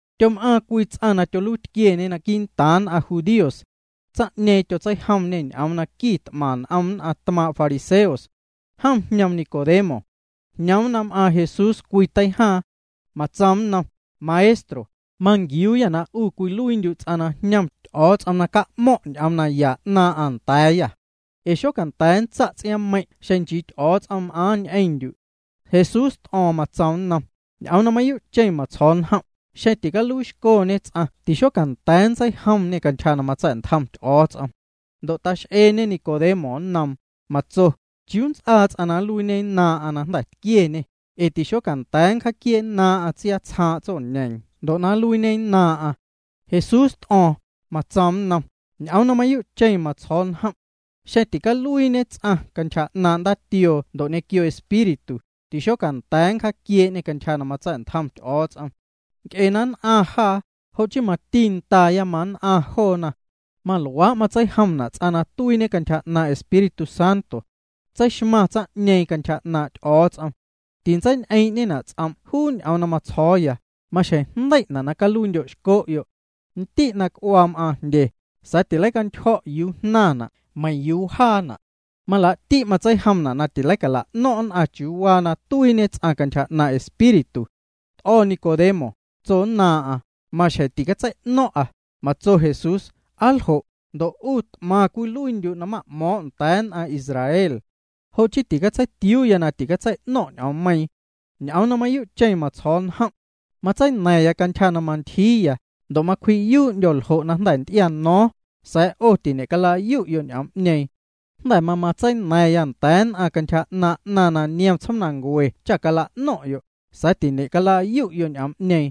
Tyom'aaⁿ cwii ts'aⁿ na tyoluiitquieñe quii'ntaaⁿ nn'aⁿ judíos. Tsaⁿ'ñeeⁿ tyotseijomñê ñ'oom na quit'maⁿ n'om nn'aⁿ tmaaⁿ' fariseos. Jom jñoom Nicodemo. Jñoom na m'aaⁿ Jesús cwii teijaaⁿ. Matsoom nnom: —Maestro, manquiuuyâ na 'u cwiluiindyu' ts'aⁿ na jñom Ty'o̱o̱ts'om na ca'mo̱ⁿ' ñ'oom naya 'naaⁿ'aⁿ nda̱a̱yâ. Ee xocanda̱a̱ nntsa' ts'iaaⁿmeiⁿ' xeⁿ nchii Ty'o̱o̱ts'om m'aaⁿ ñ'eⁿndyu'. Jesús t'o̱o̱ⁿ, matsoom nnom: —Ñ'oom na mayuu'cheⁿ matsjo̱o̱ njom', xeⁿ ticaluiixcoñe ts'aⁿ tixocanda̱a̱ nntseijomñe cantyja na matsa̱'ntjom Ty'o̱o̱ts'om. Ndo' tax'eeñe Nicodemo nnoom, matso: —¿Chiuu nnts'aa ts'aⁿ na nluiiñennaaⁿ'aⁿ na jnda̱ tquieñê? Ee tixocanda̱a̱ nncjaaquiee'nnaaⁿ'aⁿ tsiatsjaaⁿ' tsoñeeⁿ ndo' na nluiiñennaaⁿ'aⁿ. Jesús t'o̱o̱ⁿ, matsoom nnom: —Ñ'oom na mayuu'cheⁿ matsjo̱o̱ya njom'. Xeⁿ ticaluiiñe ts'aⁿ cantyja 'naaⁿ' ndaatioo ndo' ñequio Espíritu, tixocanda̱a̱ nncjaquiee'ñê cantyja na matsa̱'ntjom Ty'o̱o̱ts'om. Nc'e na nn'aⁿ jaa, jo' chii mati ndaaya mann'aⁿ joona. Maluaa' matseijomna' ts'aⁿ na tuiiñe cantyja 'naaⁿ' Espíritu Santo. Tseixmaⁿ tsaⁿ'ñeeⁿ cantyja 'naaⁿ' Ty'o̱o̱ts'om. Tinntseiñ'eeⁿ'ñena' ts'om' juu ñ'oom na matsjo̱o̱ya: “Maxjeⁿ jndei'na' na caluiindyo'xco'yo'.” Ndi' na c'uaa cam'aaⁿ jndye, sa̱a̱ tileicantyjo̱' yuu jnaⁿna', meiⁿ yuu wjaana'. Malaa'ti' matseijomna' na tileicala'no̱ⁿ' nn'aⁿ chiuu waa na tuiiñe ts'aⁿ cantyja 'naaⁿ' Espíritu. T'o̱ Nicodemo, tsonnaaⁿ'aⁿ: —Maxjeⁿ ticatsei'no̱ⁿ'a. Matso Jesús: —Aa ljo', ndo' 'u t'maⁿ cwiluiindyu' na ma'mo̱o̱ⁿ' nda̱a̱ nn'aⁿ Israel. Jo' chii ticatseitiuuya na tileicatsei'no̱ⁿ' ñ'oommeiiⁿ. Ñ'oom na mayuu'cheⁿ matsjo̱o̱ya njom'. Matseina̱ⁿya cantyja na mantyjiiya, ndo' macwji'yuu'ndyo̱ ljo' na jnda̱ nty'iano̱o̱ⁿ, sa̱a̱ 'o tiñe'calayu'yo' ñ'oom'ñeeⁿ. Jnda̱ mamatseina̱ⁿya nda̱a̱ nn'aⁿ cantyja 'naaⁿ 'naⁿ na niom tsjoomnancue cha cala'no̱ⁿ'yo', sa̱a̱ tiñe'calayu'yo' ñ'oom'ñeeⁿ.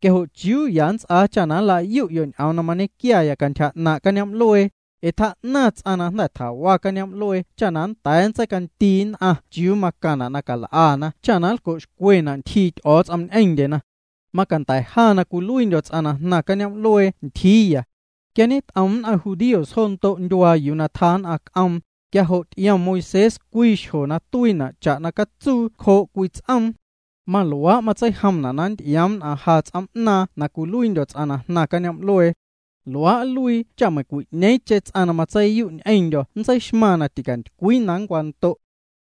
Quia jo', ¿chiuu ya nnts'aa cha na nlayu'yo' ñ'oom na mañequia cantyja 'naaⁿ' cañoom'luee? ’Ee tjaa'naⁿ ts'aⁿ na jnda̱ tjawa cañoom'luee cha nnda̱a̱ nntseicandii nn'aⁿ chiuu macaⁿna' na cal'ana na nlco'xcwena' ntyjii Ty'o̱o̱ts'om ñ'eⁿndyena. Macanda̱ ja na cwiluiindyo̱ ts'aⁿ na jnaaⁿya cañoom'luee ntyjiiya. Quia ñet'om nn'aⁿ judíos jo ndo' ndyuaa yuu na tjaa nn'aⁿ c'om, quia jo' ty'iom Moisés cwii xjo na tuiina' cha'na catsuu cjoo' cwii ts'oom. Maluaa' matseijomna' na nnty'ioom nn'aⁿ ja ts'oom'naaⁿ na cwiluiindyo̱ ts'aⁿ na jnaaⁿya cañoom'luee. Luaa' nluii cha meiⁿcwi'ñeeⁿcheⁿ ts'aⁿ na matseiyu' ñ'eⁿndyo̱ nntseixmaⁿ na ticantycwii na nncwando'.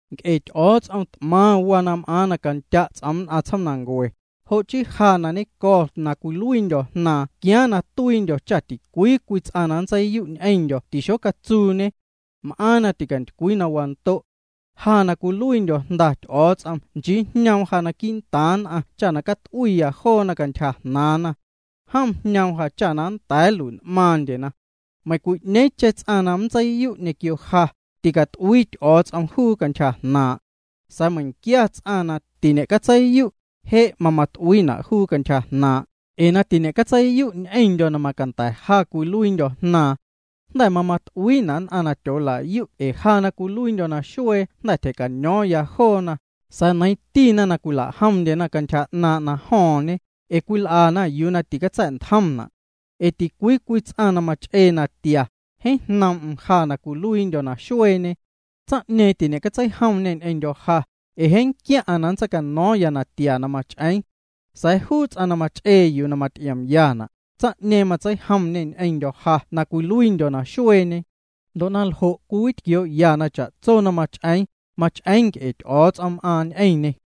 ’Nc'e Ty'o̱o̱ts'om t'maⁿ waa na m'aaⁿ na candya' ts'oom nn'aⁿ tsjoomnancue, jo' chii Ja na ñennco̱ na cwiluiindyo̱ Jnaaⁿ tquiaaⁿ na tuiindyo̱ cha ticwii cwii ts'aⁿ na nntseiyu' ñ'eⁿndyo̱ tixocatsuuñe. M'aaⁿ na ticantycwii na wando'. Ja na cwiluiindyo̱ Jnda Ty'o̱o̱ts'om nchii jñoom ja quii'ntaaⁿ nn'aⁿ cha na cat'uiiya joona cantyja jnaaⁿna. Jom jñoom ja cha nnda̱a̱ nlui'n'maaⁿndyena. ’Meiⁿcwi'ñeeⁿcheⁿ ts'aⁿ na nntseiyu' ñequio ja, ticat'uii Ty'o̱o̱ts'om juu cantyja 'naaⁿ' jnaaⁿ'. Sa̱a̱ meiⁿquia ts'aⁿ na tiñe'catseiyu', je' mamat'uiina' juu cantyja jnaaⁿ', ee na tiñe'catseiyu' ñ'eⁿndyo̱ na macanda̱ ja cwiluiindyo̱ Jnaaⁿ. Jnda̱ mamat'uiina' nn'aⁿ na tyoolayu' ee ja na cwiluiindyo̱ naxuee jnda̱ tyja̱cano̱o̱ⁿya joona, sa̱a̱ neiiⁿtina' na cwila'jomndyena cantyja 'naaⁿ' na jo̱o̱ⁿñe, ee cwil'ana yuu na ticatsa̱ntjomna'. Ee ticwii cwii ts'aⁿ na mach'ee natia, jeeⁿ jnoom'm ja na cwiluiindyo̱ naxueeñe. Tsaⁿ'ñeeⁿ tiñe'catseijomñê ñ'eⁿndyo̱ ja, ee jeeⁿ nquiaⁿ'aⁿ na nntseicano̱o̱ⁿya natia na mach'eeⁿ. Sa̱a̱ juu ts'aⁿ na mach'ee yuu na maty'iomyana', tsaⁿ'ñeeⁿ matseijomñê ñ'eⁿndyo̱ ja na cwiluiindyo̱ naxueeñe. Ndo' na ljo' cwiwitquioo'ya na cha'tso na mach'eeⁿ, mach'eeⁿ nc'e Ty'o̱o̱ts'om m'aaⁿ ñ'eⁿñê.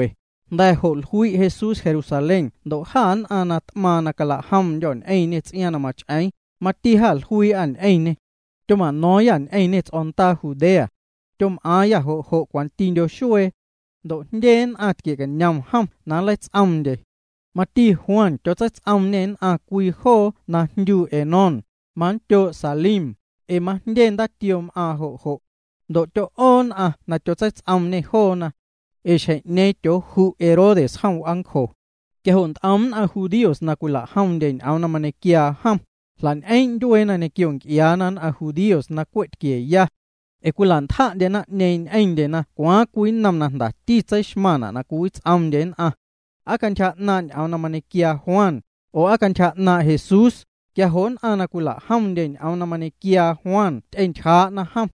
Jnda̱ jo' jlui' Jesús Jerusalén ndo' jâ nn'aⁿ na t'maaⁿ na cala'jomndyô̱ ñ'eⁿ ts'iaaⁿ na mach'eeⁿ, mati jluii'â ñ'eⁿñê. Tyoma'no̱o̱ⁿyâ ñ'eⁿñê ts'o̱ndaa Judea. Tyom'aaⁿyâ jo' jo' cwantindyo xuee. Ndo' jndye nn'aⁿ tquie'cañom jom na nleits'oomndye. Mati Juan tyotseits'oomñê nn'aⁿ cwii joo na jndyu Enón, manndyoo' Salim, ee majndye ndaatioo m'aaⁿ jo'. Ndo' tyo'oo nn'aⁿ na tyotseits'oomñê joona. Ee xjeⁿ'ñeeⁿ tyooju' Herodes jom w'aancjo. Quia jo' nt'om nn'aⁿ judíos na cwila'jomndye ñ'oom na mañequiaa jom, jla'ñ'eeⁿ' ndyueena ñequio nc'iaana nn'aⁿ judíos na cwe' tquieya. Ee cwila'ntja'ndye naⁿ'ñeeⁿ ñ'eⁿndyena cwaaⁿ cwii nnom na jndati tseixmaⁿ na cwiwits'oomndye nn'aⁿ. ¿Aa cantyja 'naaⁿ' ñ'oom na mañequiaa Juan, oo, aa cantyja 'naaⁿ' Jesús? Quia jo' nn'aⁿ na cwila'jomndye ñ'oom na mañequiaa Juan ty'entyjaa'na jom.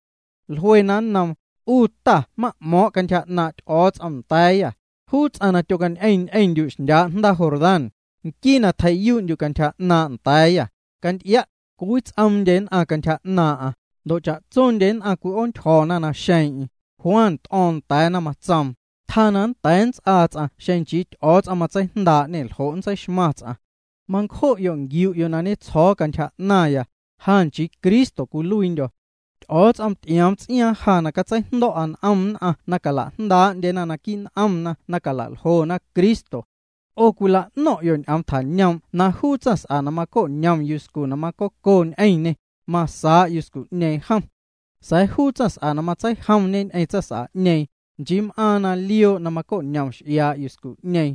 Jluena nnoom: —'U ta na ma'mo̱o̱ⁿ' cantyja 'naaⁿ' Ty'o̱o̱ts'om nda̱a̱yâ, juu ts'aⁿ na tyocañ'eⁿ ñ'eⁿndyu' xndyaa' jndaa Jordán, nquii na tjei'yuu'ndyu' cantyja 'naaⁿ' nda̱a̱yâ, canty'ia', cwiwits'oomndye nn'aⁿ cantyja 'naaⁿ'aⁿ, ndo' cha'tsondye nn'aⁿ cwi'oontyjo̱ naxeeⁿ'eⁿ. Juan t'o̱o̱ⁿ nda̱a̱na, matsoom: —Tjaa na nnda̱a̱ nnts'aa ts'aⁿ xeⁿ nchii Ty'o̱o̱ts'om matseijndaa'ñê ljo' nntseixmaⁿ ts'aⁿ. Mancjo'yo' nquiu'yo' na ñetsjo̱o̱ cantyja 'naⁿya, ja nchii Cristo cwiluiindyo̱. Ty'o̱o̱ts'om ty'ioom ts'iaaⁿ ja na catseijndo̱'a n'om nn'aⁿ na cala'jndaa'ndyena naquii' n'omna na cala'ljona Cristo. 'O cwila'no̱ⁿ'yo' ñ'oom na tjañoom' na juu tsaⁿs'a na maco'ñom yuscu na macoco ñ'eⁿñê, masaa' yuscu'ñeeⁿ jom. Sa̱a̱ juu ts'aⁿ na matseijomñe ñ'eⁿ tsaⁿs'a'ñeeⁿ, nchii m'aaⁿ na lioo' na maco'ñom x'iaa' yuscu'ñeeⁿ.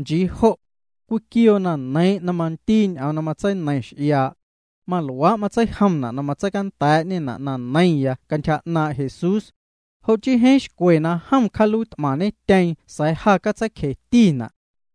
Nchii jo'. Cwiquioo na neiiⁿ' na mandiiñe ñ'oom na matseineiⁿ x'iaa'. Maluaa' matseijomna' na matseicanda̱a̱'ñena' na neiⁿya cantyja 'naaⁿ' Jesús. Jo' chii jeeⁿ xcwe na jom cjaaluiit'maⁿñetyeeⁿ sa̱a̱ ja catseicjetina'.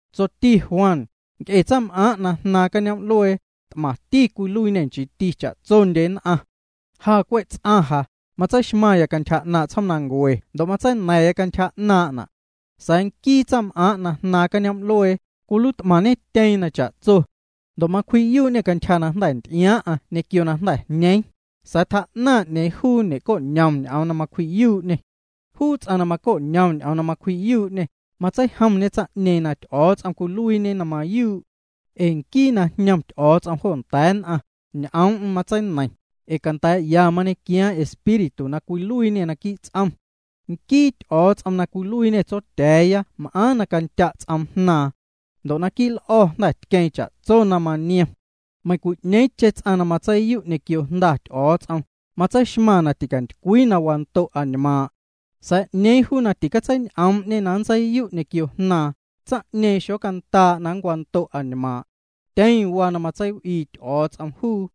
Tsoti Juan: —Nc'e tsaⁿm'aaⁿ' jnaaⁿ cañoom'luee, t'maⁿti cwiluiiñê, nchiiti cha'tsondye nn'aⁿ. Ja na cwe' ts'aⁿ ja, matseixmaⁿya cantyja 'naaⁿ' tsjoomnancue ndo' matseina̱ⁿya cantyja 'naaⁿ'na'. Sa̱a̱ nquii tsaⁿm'aaⁿ' na jnaaⁿ cañoom'luee, cwiluiit'maⁿñetyeeⁿ na cha'tso. Ndo' macwji'yuu'ñê cantyja na jnda̱ nty'iaaⁿ'aⁿ ñequio na jnda̱ jñeeⁿ, sa̱a̱ tjaa'naⁿ 'ñeeⁿ juu ñe'co'ñom ñ'oom na macwji'yuu'ñê. Juu ts'aⁿ na maco'ñom ñ'oom na macwji'yuu'ñê, matseijomñe tsaⁿ'ñeeⁿ na Ty'o̱o̱ts'om cwiluiiñe na mayuu'. Ee nquii na jñom Ty'o̱o̱ts'om jo nda̱a̱ nn'aⁿ, ñ'oom'm matseineiⁿ, ee canda̱a̱'ya mañequiaaⁿ Espíritu na cwiluiiñê naquii' ts'om. Nquii Ty'o̱o̱ts'om na cwiluiiñê Tsotya̱a̱ya m'aaⁿ na candya' ts'oom Jnaaⁿ. Ndo' naquii' l'o̱ jnda̱ tqueeⁿ cha'tsoti na maniom. Meiⁿcwi'ñeeⁿcheⁿ ts'aⁿ na matseiyu' ñequio Jnda Ty'o̱o̱ts'om, matseixmaⁿ na ticantycwii na wando' añmaaⁿ'. Sa̱a̱ 'ñeeⁿ juu na ticatseiñ'oom'ñe na nntseiyu' ñequio Jnaaⁿ, tsaⁿ'ñeeⁿ xocandaa' na nncwando' añmaaⁿ'. Tyeⁿ waa na matseiw'ii Ty'o̱o̱ts'om juu.